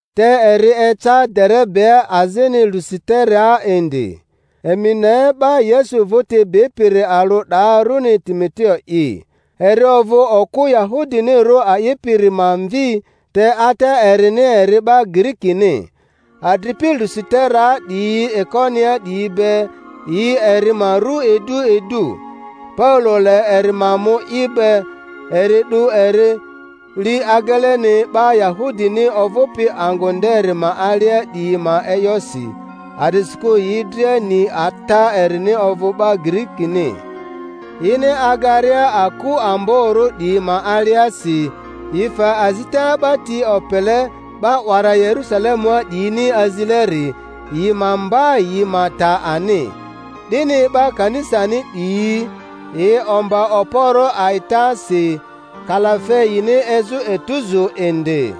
Te eri eca Derebea azini Lusiteraa indi. Emi ne, 'ba Yesu vᴜti bipiri alᴜ 'daa, runi Timoteo'i. Eri ovᴜ okᴜ Yahudinirᴜ a'ipiri ma mvi, te ata erini eri 'ba Girikini. Adripi Lusiteraa 'diyi Ikoniaa 'diyi be, yi eri ma ru idu idu. Paulo le eri ma mu i be; eri 'du eri, li ageleni 'ba Yahudini ovᴜpi angᴜ nderi ma alia 'diyi ma e'yosi, a'disikᴜ yi dria ni ata erini ovᴜ 'ba Girikini. Yini agaria aku amborᴜ 'diyi ma aliasi, yi fe azita 'ba ti opele 'ba 'wara Yerusalemua 'diyini azileri, yi ma mba yi ma ta ani. 'Dini 'ba kanisani 'diyi yi omba okporᴜ a'itasi, kalafe yini ezᴜ etuzu indi.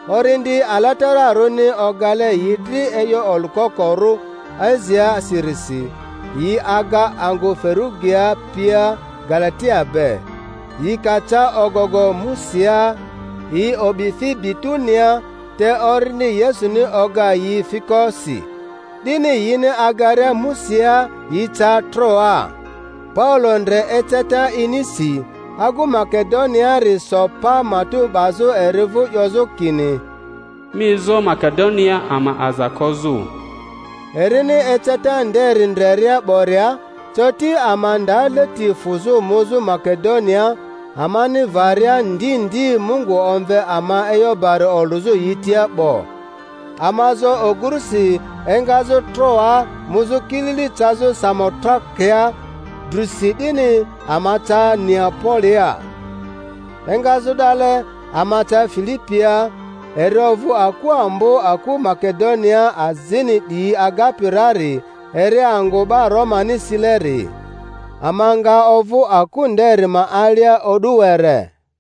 Orindi Alatararᴜni ogale yi dri e'yo olᴜkokorᴜ Asiaa sirisi, yi aga angᴜ Ferᴜgia pia Galatia be. Yi ka ca ogogo Musiaa, yi o'bi fi Bituniaa, te Orindi Yesuni oga yi fiko si; 'dini yini agaria Musiaa yi ca Troaa. Paulo ndre eceta inisi: agu Makedoniaari so pa matᴜ 'bazᴜ eri vᴜ 'yozᴜ kini, Mi ezo Makedoniaa ama aza kozᴜ! Erini eceta nderi ndreria 'boria, coti ama nda leti fᴜzᴜ muzᴜ Make-doniaa, amani varia ndi ndi Mungu omve ama e'yo bari olᴜzᴜ yi tia 'bo. Ama zo ogurusi engazᴜ Troaa muzᴜ kilili cazᴜ Samotrakea, drusi 'dini ama ca Neapolia. Engazᴜ 'dale ama ca Filipia, eri ovᴜ aku ambo aku Makedoniaa azini 'diyi agapi rari, eri angᴜ 'ba Romani sileri. Ama nga ovᴜ aku nderi ma alia o'du were.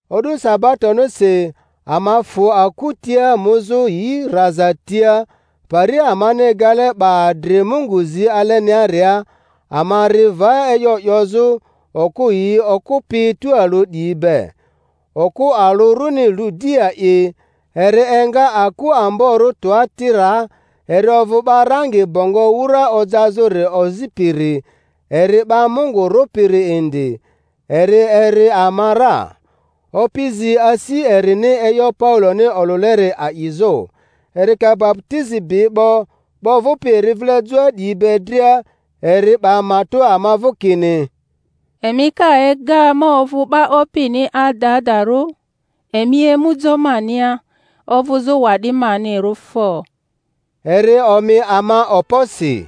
O'du sabatonisi ama fᴜ aku tia muzᴜ yi raza tia, pari amani egale 'ba adri Mungu zi aleniaria; ama ri va e'yo 'yozᴜ okᴜ yi okᴜpi tualᴜ 'diyi be. Okᴜ alᴜ runi Ludia'i, eri enga aku amborᴜ Tuatiraa, eri ovᴜ 'ba rangi bongo wura ojazᴜri ozipiri, eri 'ba Mungu rᴜpiri indi, eri eri ama ra. Opi zi asi erini e'yo Pauloni olᴜleri a'izᴜ. Eri ka baputizi bi 'bo, 'ba ovᴜpi eri vile joa 'diyi be dria, eri 'ba matᴜ ama vᴜ kini, Emi ka ega ma ovᴜ 'ba Opini adadarᴜ, emi emu jo mania ovᴜzᴜ wa'di manirᴜ fo! Eri omi ama okposi.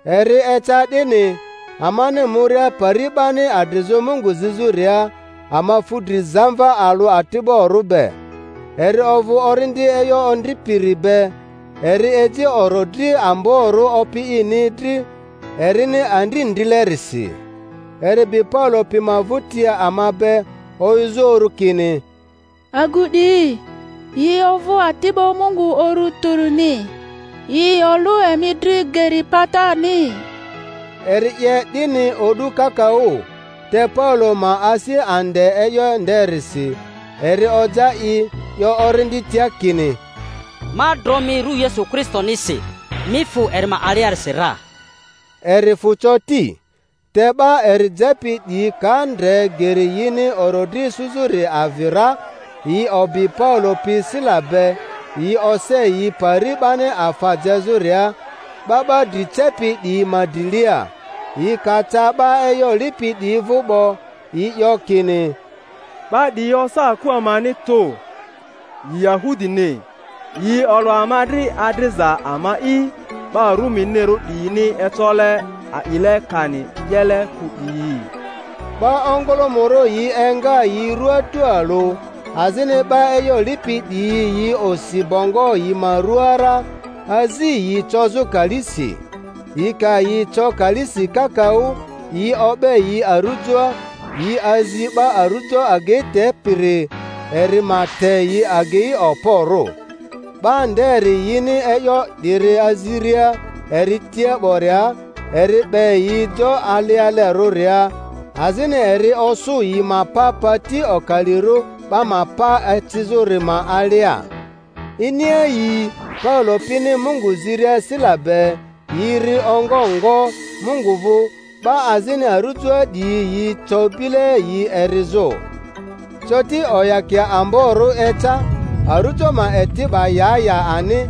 Eri eca 'dini, amani muria pari 'bani adrizᴜ Mungu zizᴜria, ama fu dri zamva alᴜ ati'borᴜ be. Eri ovᴜ orindi e'yo ondripiri be, eri eji orodri amborᴜ opi ini dri erini andri ndrilerisi. Eri bi Paulo pi ma vᴜti ama be, oyᴜzᴜ uru kini, Agu 'diyi yi ovᴜ ati'ba Mungu Uru Tᴜrini, yi olᴜ emi dri geri patani. Eri 'ye 'dini o'du kakaᴜ. Te Paulo ma asi ande e'yo nderisi, eri oja i, 'yo orindi tia kini, Ma dro mi ru Yesu Kristonisi, mi fᴜ eri ma aliasi ra! Eri fᴜ coti. Te 'ba eri jepi 'diyi ka ndre geri yini orodri isuzᴜri avi ra, yi obi Paulo pi Sila be, yi ose yi pari 'bani afa jezᴜria, 'ba 'ba dri cepi 'diyi ma drilia. Yi ka ca 'ba e'yo lipi 'diyi vᴜ 'bo, yi 'yo kini, 'Ba 'diyi yi osa aku amani tᴜ, yi Yahudini. Yi olᴜ ama dri adriza ama'i 'ba Ruminirᴜ 'diyini ecole a'ile kani 'yele kᴜ 'diyi. 'Ba ongᴜlᴜmᴜrᴜ yi enga yi rᴜaa tualᴜ; azini 'ba e'yo lipi 'diyi yi osi bongo yi ma ruaa ra, azi yi cozᴜ kalisi. Yi ka yi co kalisi kakaᴜ, yi o'be yi arujoa, yi azi 'ba arujo agei tepiri eri ma te yi agei okporᴜ. 'Ba nderi yini e'yo 'diri aziria eri tia 'boria, eri 'be yi jo alialerᴜria, azini eri osᴜ yi ma pa pati okalirᴜ 'ba ma pa ecizᴜri ma alia. Iniayii Paulo pini Mungu ziria Sila be, yi ri ongo ngo Mungu vᴜ, 'ba azini arujoa 'diyi yi co bile yi erizᴜ. Coti oyakia amborᴜ eca, arujo ma eti 'ba ya ya ani;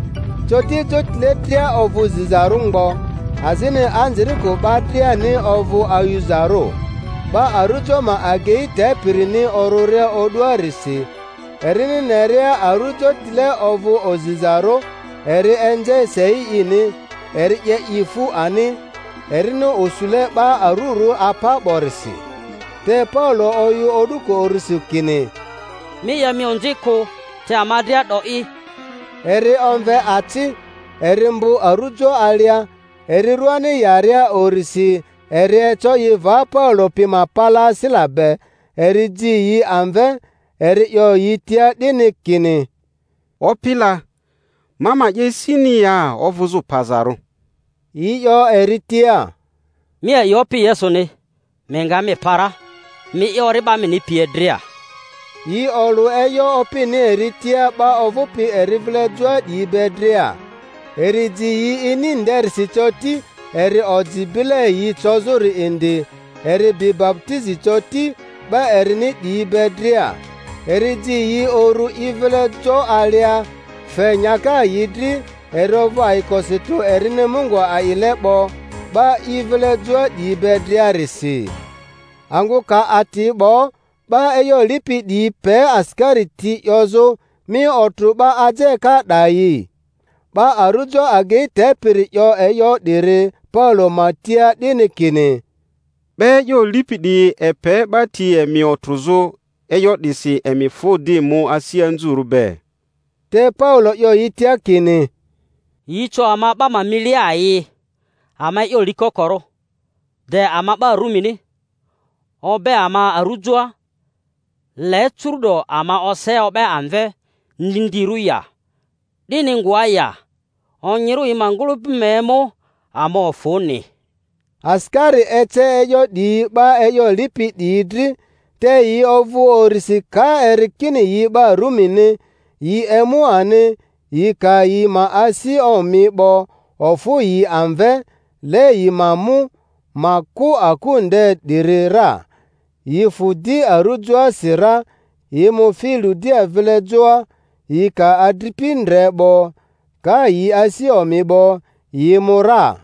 coti jotile dria ovᴜ zizarᴜ mgbo, azini anzirikᴜ 'ba driani ovᴜ ayuzarᴜ. 'Ba arᴜjo ma agei tepirini orᴜria o'duarisi, erini neria arujotile ovᴜ ozizarᴜ, eri enze sei ini, eri 'ye i fu ani, erini osule 'ba arurᴜ apa 'borisi. Te Paulo oyᴜ o'duko urusi kini, Mi 'ye mi onzi kᴜ, te ama dria 'do'i! Eri omve aci, eri mbᴜ arujo alia; eri ruani yaria urisi eri eco i va Paule pi ma drilia Sila be, eri ji yi amve, eri 'yo yi tia 'dini kini, Opi la! ma ma 'ye sini ya ovᴜzᴜ pazarᴜ? Yi 'yo eri tia, Mi a'i Opi Yesuni, mi nga mi pa ra, mi'i, ori'ba mini pie dria. Yi olᴜ e'yo Opini eri tia 'ba ovᴜpi eri vile joa 'diyi be dria. Eri ji yi ini nderisi coti, eri oji bile yi cozᴜri indi; eri bi baputizi coti, 'ba erini 'diyi be dria. Eri ji yi uru i vile jo alia, fe nyaka yi dri; eri ovᴜ ayikosi tᴜ erini Mungu a'ile 'bo 'ba i vile joa 'diyi be driarisi. Angᴜ ka ati 'bo, 'ba e'yo lipi 'diyi pe asikari ti 'yozᴜ, Mi otrᴜ 'ba ajeka 'dayi. 'Ba arujo agei tepiri 'yo e'yo 'diri Paulo ma tia 'dini, kini, 'Ba e'yo lipi 'diyi epe 'ba ti emi otrᴜzᴜ; e'yo 'disi emi fᴜ di mu asi anzurᴜ be. Te Paulo 'yo yi tia kini, Yi co ama 'ba ma milia ayii, ama e'yo likokorᴜ, de ama 'ba Rumini, o'be ama arujoa; le curu'do ama ose o'be amve ndindirᴜ ya? 'Dini ngoa ya! Onyirᴜ yi ma ngᴜlᴜpi ma emu ama ofᴜni. Asikari ece e'yo 'diyi 'ba e'yo lipi 'diyi dri, te yi ovᴜ urisi ka eri kini yi 'ba Rumini; yi emu ani, yi ka yi ma asi omi 'bo, ofᴜ yi amve, le yi ma mu, ma kᴜ aku nde 'diri ra. Yi fᴜ di arᴜjoasi ra, yi mu fi Ludia vile joa; yi ka adripi ndre 'bo, ka yi asi omi 'bo, yi mu ra.